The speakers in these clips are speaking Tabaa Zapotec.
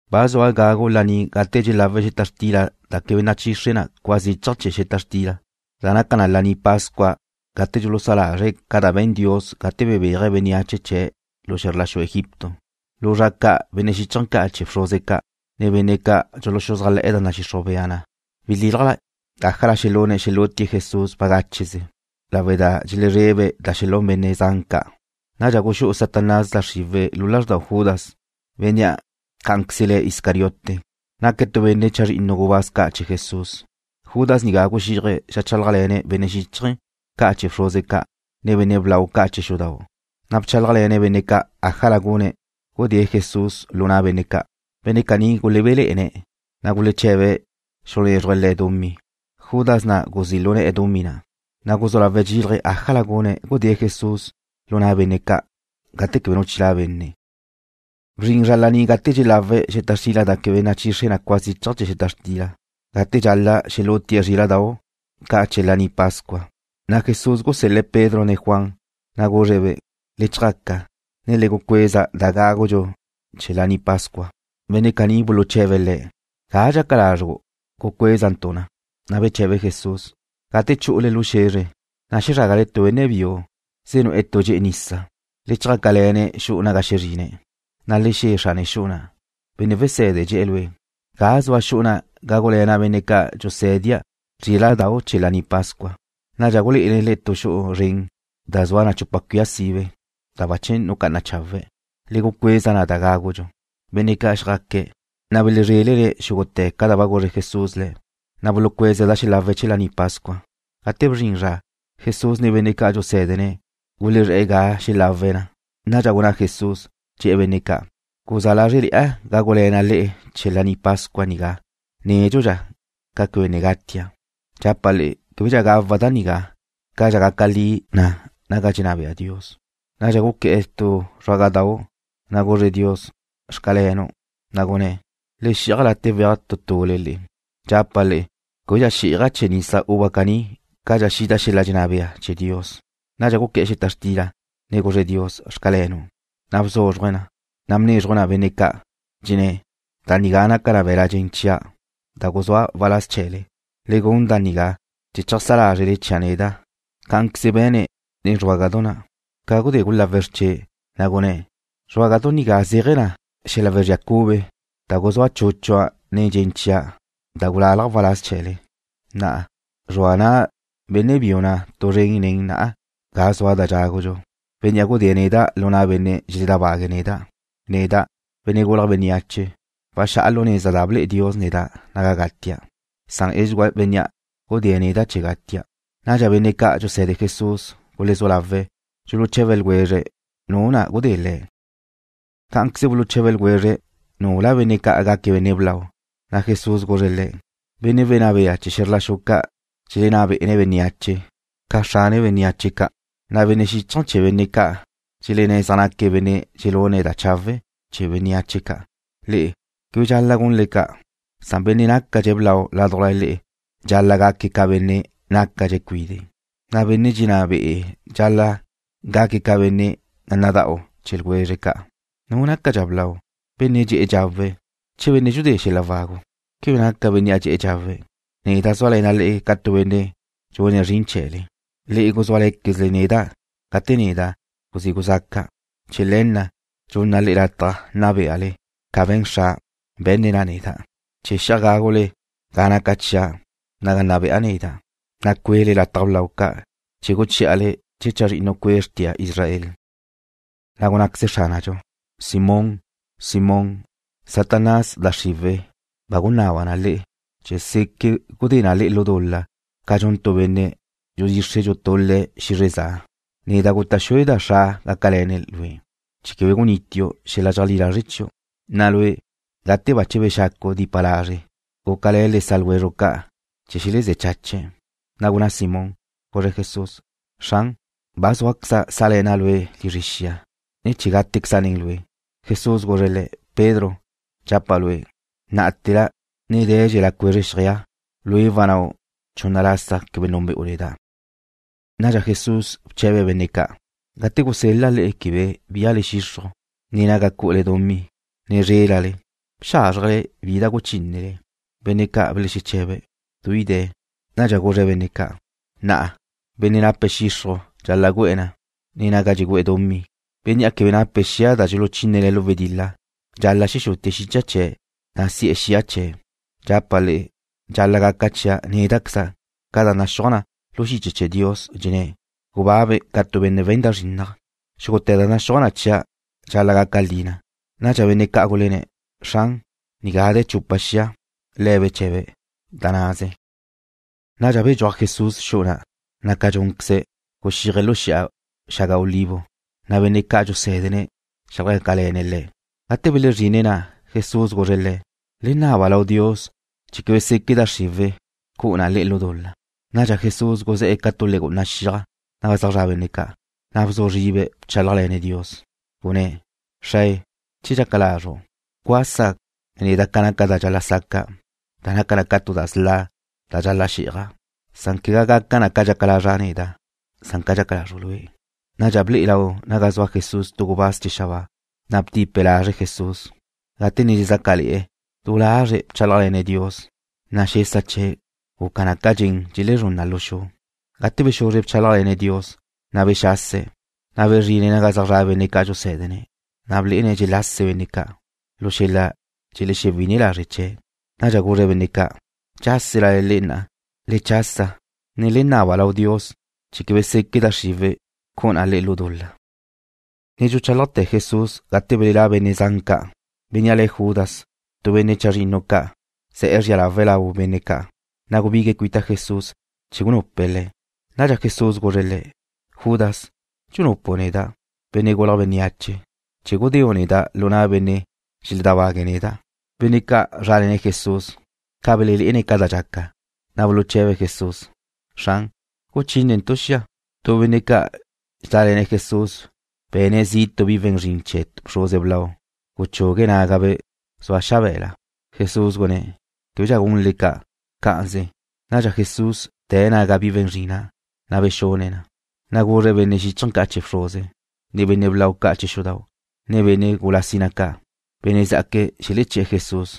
Ba zua gagu laní gate dxelawe̱' xeta xtila da quebe nachixre cua zichaj chee̱ xeta xtila, da naca na Laní Pascua gate dxulusá lazre̱' ca da be̱n Dios gate bebéaje̱' bénneache chee̱' lu xe̱zr la xu Egipto. Lu zra ca' benne' xíchaje̱ ca' chee̱ bxruze ca', ne benne' ca' dxuluxuzájle̱'e̱ da nadxixruj bea na belílaje̱' ájala xelune̱' xelútie̱' Jesús bagácheze, lawe' da dxelezrebe̱' da xelún benne' zan ca'. Nadxa guxú'u Satanás da xriwe̱' lu lázrdau Judas, bénnea' cá'anqueze le̱' Iscariote. Naque̱' tu benne' chazrinnu gubáz ca' chee̱ Jesús. Judas nigá guxíaje̱' xeajchálajle̱ne̱' benne' xíchaje̱ ca' chee̱ bxruze ca', ne benne' blau ca' chee̱ xudau', na' bchálajle̱ne̱' benne' ca' ájala gune̱' gudée̱' Jesús lu na' benne' ca'. Benne' caní gulebene̱', na' guleche̱be lazre̱' xulunézruje̱' le̱' dumí. Judas na' guzí' lu ne̱'e̱ dumí na', na' guzú lawe̱' dxílaje̱' ájala gune̱' gudée̱' Jesús lu na' benne' ca' gate quebe nu chilá' benne'. Bzrin zra laní gate dxelawe̱' xeta xtila da quebe nachixre cua zichaj chee̱ xeta xtila, gate dxal-la' xelútie̱' zríla'dau' ca' chee̱ Laní Pascua. Na' Jesús gusel-le̱' Pedro ne Juan, na' guzre̱'-be': ―Le chjaca, ne le gucuéza da gágudxu chee̱ Laní Pascua. Benne' caní buluche̱be̱' Le̱': ―¿Ga dxaca lazru' gucuézentu' na? Na' beche̱be Jesusen': ―Gate chu'ule lu xe̱zre, na' xezrágale tu benne' biu zenu'e̱ tu dxe'e nisa. Le chjácale̱ne̱' xu'u naga xezrine̱', na' le xe̱ xrane xu'u na': “Benne' Wese̱de dxe̱'e̱ lue': ¿Ga zua xu'u naga gágule̱na' benne' ca' dxusé̱dea' zríla'dau' chee̱ Laní Pascua?” Nadxa gulé'ene̱' le'e tu xu'u zren da zua chupa cuia sibe, da bache nucá'ana chawe'. Le gucuéza da gágudxu na'. Benne' ca' xjaque̱', na' belezrélene̱' xúgute̱ ca da ba guzre Jesús le̱', na' bulucueze̱' da xelawe̱' chee̱ Laní Pascua. Gate bzrin zra, Jesús ne benne' ca' dxusé̱dene̱' gulezré̱'e̱ ga xelawe̱' na. Nadxa gunná Jesús, dxe̱'e̱ benne' ca': ―Guzá lázrele̱'a gágule̱na' le'e chee̱ Laní Pascua nigá nédxudxa ca quebe ne gatia'. Dxapa' le'e québedxa gawa' da nigá cadxa gaca li na naga dxenná bea Dios. Nadxa guqué̱'e̱ tu zruágadau', na' guzre̱' Dios: “Xcalenu'”, na' gunné̱': ―Le xi'aj late' weaj tu tule le'e. Dxapa' le'e québedxa xí'aja' chee̱ nisa uva caní cadxa xida xel-la dxenná bea chee̱ Dios. Nadxa guqué̱'e̱ xeta xtila, ne guzre̱' Dios: “Xcalenu'”, na' bzúzruje̱' na, ne bnézruje̱' na benne' ca', dxenné̱': ―Da nigá naca na be̱l-la' dxen chia', da guzúa' waláz chee̱le. Le gun da nigá chee̱ cheajsá lázrele chia' neda'. Cá'anqueze be̱ne̱' nen zruágadau' na' ca gudé gulawe̱' xrche', na' gunné̱': ―Zruágadau' nigá zéaje̱ na xel-la wezría cube, da guzúa chúchua' nen dxen chia', da gulálaja' waláz chee̱le. ’Na'a, zrua na' benne' biu na' tu zren nen na'a ga zua da dxágadxu, bénnea' gudée̱' neda' lu na' benne' dxeledábague̱' neda'. Neda', Benne' Gulje̱' Bénneache, waxá'a lu neza da ble'e Dios neda' naga gatia', san edxugúa bénnea' gudée̱' neda' chee̱ gatia'. Nadxa benne' ca' dxuse̱de Jesús gulezú lawe̱' dxuluche̱be ljwezre̱' nu na' gudé Jesús. Cá'anqueze buluche̱be ljwezre̱' nule̱' gácadxe̱' benne' blau. Na' Jesús guzre̱' le̱': ―Benne' wenná bea chee̱ xe̱zr la xu ca' dxelenná bé'ene̱' bénneache ca xrane bénneache ca', na' benne' xíchaje̱ chee̱ benne' ca' dxelenné̱' zaj naque̱' benne' dxelune̱' da chawe' chee̱ benneáche ca'. Le'e quebe dxal-la' gunle ca'. Benne' nácadxe̱' blau ládujla le'e dxal-la' gaque̱' ca benne' nácadxe̱' cuide', na' benne' dxenná be'e̱ dxal-la' gaque̱' ca benne' nada'u chee̱ ljwezre̱' ca'. ¿Nu nácadxa blau, benne' dxe'e̱ dxawe̱', che benne' dxudée̱' xel-la wagu? ¿Quebe naca bénnea' dxe'e̱ dxawe̱'? Neda' zúale̱na' le'e ca tu benne' dxune̱' zrin chee̱le. ’Le'e guzúale̱quezle neda' gate neda' guzí guzaca'. Chee̱ le̱ na' dxunna' le'e lataj nna beale, ca be̱n Xra', be̱nne̱' na neda', chee̱ xi'aj gágule ga naca chia' naga nna be'a neda', na' cue'le lataj blau ca' chee̱ guchí'ale chee̱ chazrinnu cue' xrtia Israel. Na' gunnáqueze Xránadxu: ―Simón, Simón, Satanás, da xriwe̱' ba gunaba na le'e chee̱ seque gudé na le'e lu dul-la ca dxun tu benne' dxudxixre dxutul-le̱' xizre za. Neda' guta' xueda' Xra' gácale̱ne̱' lue' chee̱ quebe guníteu' xel-la dxeajlí lazre chiu'. Na' lue', gate bache bexacu' dipa lazre', gúcale̱ le sa' ljwezru' ca' chee̱ xelezé̱ chache̱'. Na' gunná Simón, guzre̱' Jesús: ―Xran, ba zúaqueza' sá'le̱na' Lue' lizre xia, ne chee̱ gátequeza' nen Lue'. Jesús guzre̱' le̱': ―Pedro, dxapa' lue', ná'ate̱la ne dé̱dxela cuezre xjeaj, lue' wannáu' chunna lasa quebe núnbe'u neda'. Nadxa Jesús bche̱be̱' benne' ca': ―Gate gusel-la' le'e quebe bíale xixruj, ne naga cu'ule dumí, ne zrélale, ¿bxázrjele bi da guchínnele? Benne' ca' belexeche̱be̱': ―Gutu bi de̱. Nadxa guzre̱' benne' ca': ―Na'a, benne' nape̱' xixruj dxal-la' gu'e̱ na, ne naga dxugu'e̱ dumí. Bénnea' quebe nape̱' xia da dxuluchínene̱' lu wedil-la, dxal-la' xexutie̱' xicha chee̱', na' si'e̱ xia chee̱'. Dxapa' le'e dxal-la' gaca chia' néda'queza' ca da naxúaj na lu xiche chee̱ Dios, dxenné̱': “Gubabe̱' ca tu benne' we̱n da zrinnaj.” Xúgute̱ da naxúaj na chia' dxal-la' gaca li na. Nadxa benne' ca' gulenné̱': ―Xran, nigá de̱ chupa xia. Le̱' beche̱be̱': ―Da naze. Nadxa bedxúaj Jesús xu'u na', na' ca dxúnqueze̱', guxíaje̱' lu Xi'a Xaga Olivo, na' benne' ca' dxusé̱dene̱' xjácale̱ne̱' Le̱'. Gate belezrine̱' na', Jesús guzre̱' le̱': ―Le naba lau Dios chee̱ quebe seque da xriwe̱' cu'u na le'e lu dul-la. Nadxa Jesús guzé̱'e̱ ca tu legu'una xiaj naga zaj zra' benne' ca', na' bzu zribe̱' bchálajle̱ne̱' Dios. Gunne̱': ―Xrae, che dxaca lazru', bcuasa neda' ca naca da dxal-la' saca', da naca na ca tu da sla' da dxal-la' xí'aja', quegá gaca na ca dxaca lazra' neda', san ca dxaca lazru' Lue'. Nadxa ble'e lau naga zua Jesús tu gubáz chee̱ xabáa, na' btipe̱' lazre' Jesús. Gate ne dxezácale̱'e̱, du lazre̱' bchálajle̱ne̱' Dios, na' xesa chee̱' guca na ca dxen dxelezrún na lu xu. Ca bexuzre bchálajle̱ne̱' Dios, na' bexase̱', na' bezrine̱' naga zaj zra' benne' ca' dxusé̱dene̱', na' blé'ene̱' dxelase benne' ca', lu xel-la dxelexewi'ine lazre' chee̱'. Nadxa guzre̱' benne' ca': ―¿Dxáselale le'e na'a? Le chasa, ne le naba lau Dios chee̱ quebe seque da xriwe̱' cu'u na le'e lu dul-la. Ne dxuchálajte̱ Jesús gate belelá' benne' zan ca'. Bénnea' le̱' Judas, tu benne' chazrinnu ca', ze̱'e̱ zria lawe̱' lau benne' ca', na' gubigue̱' cuita Jesús chee̱ gunupe̱' Le̱'. Nadxa Jesús guzre̱' le̱': ―Judas, ¿dxunupu' neda', Benne' Gulje̱' Bénneache, chee̱ gudéu' neda' lu na' benne' dxeledábague̱' neda'? Benne' ca' zrále̱ne̱' Jesús, ca belelé'ene̱' ca da dxaca, na' buluche̱be̱' Jesús: ―Xran, ¿guchínentu' xia? Tu benne' ca' dxedále̱ Jesús be̱ne̱' zi' tu bi we̱n zrin chee̱ bxruze blau, guchugue̱' nágabe' zua xabe̱la. Jesús gunné̱': ―Québedxa gunle ca'. Cá'anze. Nadxa Jesús bte̱' naga bi we̱n zrin na', na' bexune̱' na. Na' guzre̱' benne' xíchaje̱ ca' chee̱ bxruze, ne benne' blau ca' chee̱ xudau', ne benne' gula sina ca', benne' zá'aque̱' xeleché̱'e̱ Jesús,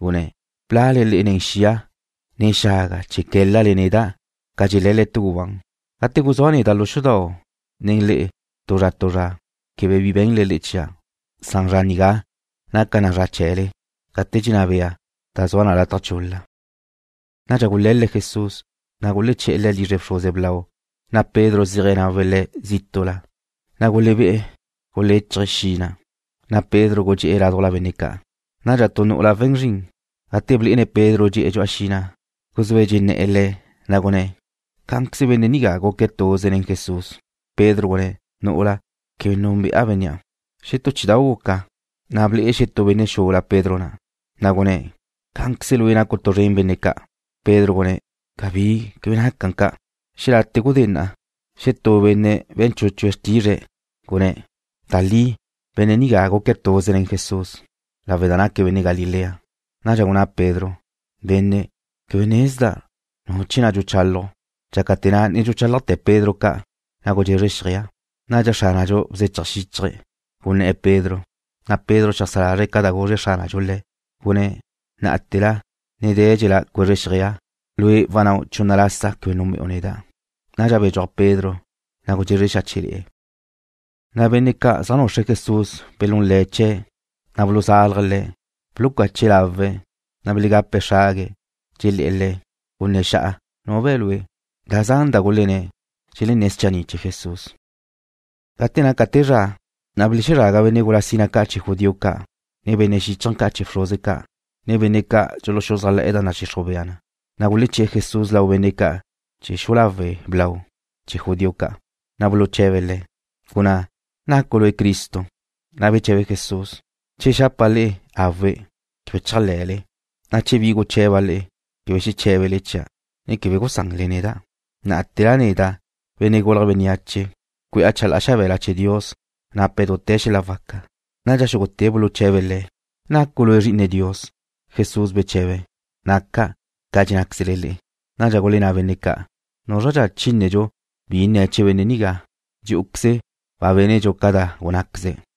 gunné̱': ―¿Blale le'e nen xia, ne xaga chee̱ qué̱lale neda' ca dxé̱lale tu gubán? Gate guzúa' neda' lu xudau' nen le'e tu zra tu zra, quebe bi be̱nle le'e chia', san zra nigá naca na zra chee̱le, gate dxenná bea da zua na lataj chul-la. Nadxa gule̱le̱' Jesús, na' guleché̱'e̱ Le̱' lizre bxruze blau, na' Pedro zíaje̱' nawe̱' Le̱' zítu'la. Na' gulebé'e̱ guléchaje̱' xi' na', na' Pedro gudxé'e̱ ládujla benne' ca'. Nadxa tu nu'ula we̱n zrin, gate blé'ene̱' Pedro dxe'e̱ dxu'a xi' na', guzúe̱' dxenné̱'e̱ le̱', na' gunné̱': ―Cá'anqueze benne' nigá guque̱' tuze le̱n Jesús. Pedro gunné̱': ―Nu'ula, quebe núnbe'a bénnea'. Xetú chí'idau' guca, na' ble'e xetú benne' xula Pedro na', na' gunné̱': ―Cá'anqueze lue' nacu' tu zren benne' ca'. Pedro gunné̱': ―Cabí. Quebe naca ca'. Xelate gudé na', xetú benne' be̱n chúchue̱' xrtizre̱', gunné̱': ―Da li, benne' nigá guque̱' tuze le̱n Jesús, lawe' da naque̱' benne' Galilea. Nadxa gunná Pedro: ―Benne', quebe nezda' nu chee̱ na' dxuchálaju'. Dxácate̱ na' ne dxuchálajte̱ Pedro ca', na' gudxezre xjeaj. Nadxa Xránadxu bzechaj xíchaje̱', gunné̱'e̱ Pedro, na' Pedro xeajsá lazre̱' ca da guzre Xránadxu le̱', gunné̱': “Ná'ate̱la ne dé̱dxela cuezre xjeaj, lue' wannáu' chunna lasa quebe núnbe'u neda'.” Nadxa bedxúaj Pedro, na' gudxezre xáche'le̱'e̱. Na' benne' ca' zaj nuxre̱' Jesús belún le̱' chee̱', na' buluzalje̱' Le̱'. Bulucache̱' lawe̱', na' belegape̱' xrague̱', dxelé̱'e̱ Le̱': ―Gunné̱ xa'a nu be̱ Lue'. Da zan da gulenné̱', dxelenné̱' schanni' chee̱ Jesús. Gate naca te zra, na' belezraga benne' gula sina ca' chee̱ judío ca', ne benne' xíchaje̱ ca' chee̱ bxruze ca', ne benne' ca' dxuluxuzájle̱'e̱ da nadxixruj bea na, na' guleché̱'e̱ Jesús lau benne' ca' chee̱ xu'u lawe' blau chee̱ judío ca'. Na' buluche̱be̱' Le̱': ―Gunná, ¿nacu' lue' Cristo? Na' beche̱be Jesús: ―Che xapa' le'e: Awe', quebe chéajle̱le, na' che bi guche̱ba' le'e, quebe xeché̱bele chia', ne quebe gusanle neda'. Ná'ate̱la neda', Benne' Gulje̱' Bénneache, cue'a chalá'a xabe̱la chee̱ Dios nape̱' dute̱ xel-la waca. Nadxa xúgute̱' buluche̱be̱' Le̱': ―¿Nacu' Lue' Zri'ine Dios? Jesús beche̱be̱': ―Naca', ca dxennáquezle le'e. Nadxa gulenná benne' ca': ―¿Núzradxa chínnedxu bi nne̱' chee̱ benne' nigá? Dxí'uqueze ba bénedxu ca da gunnáqueze̱'.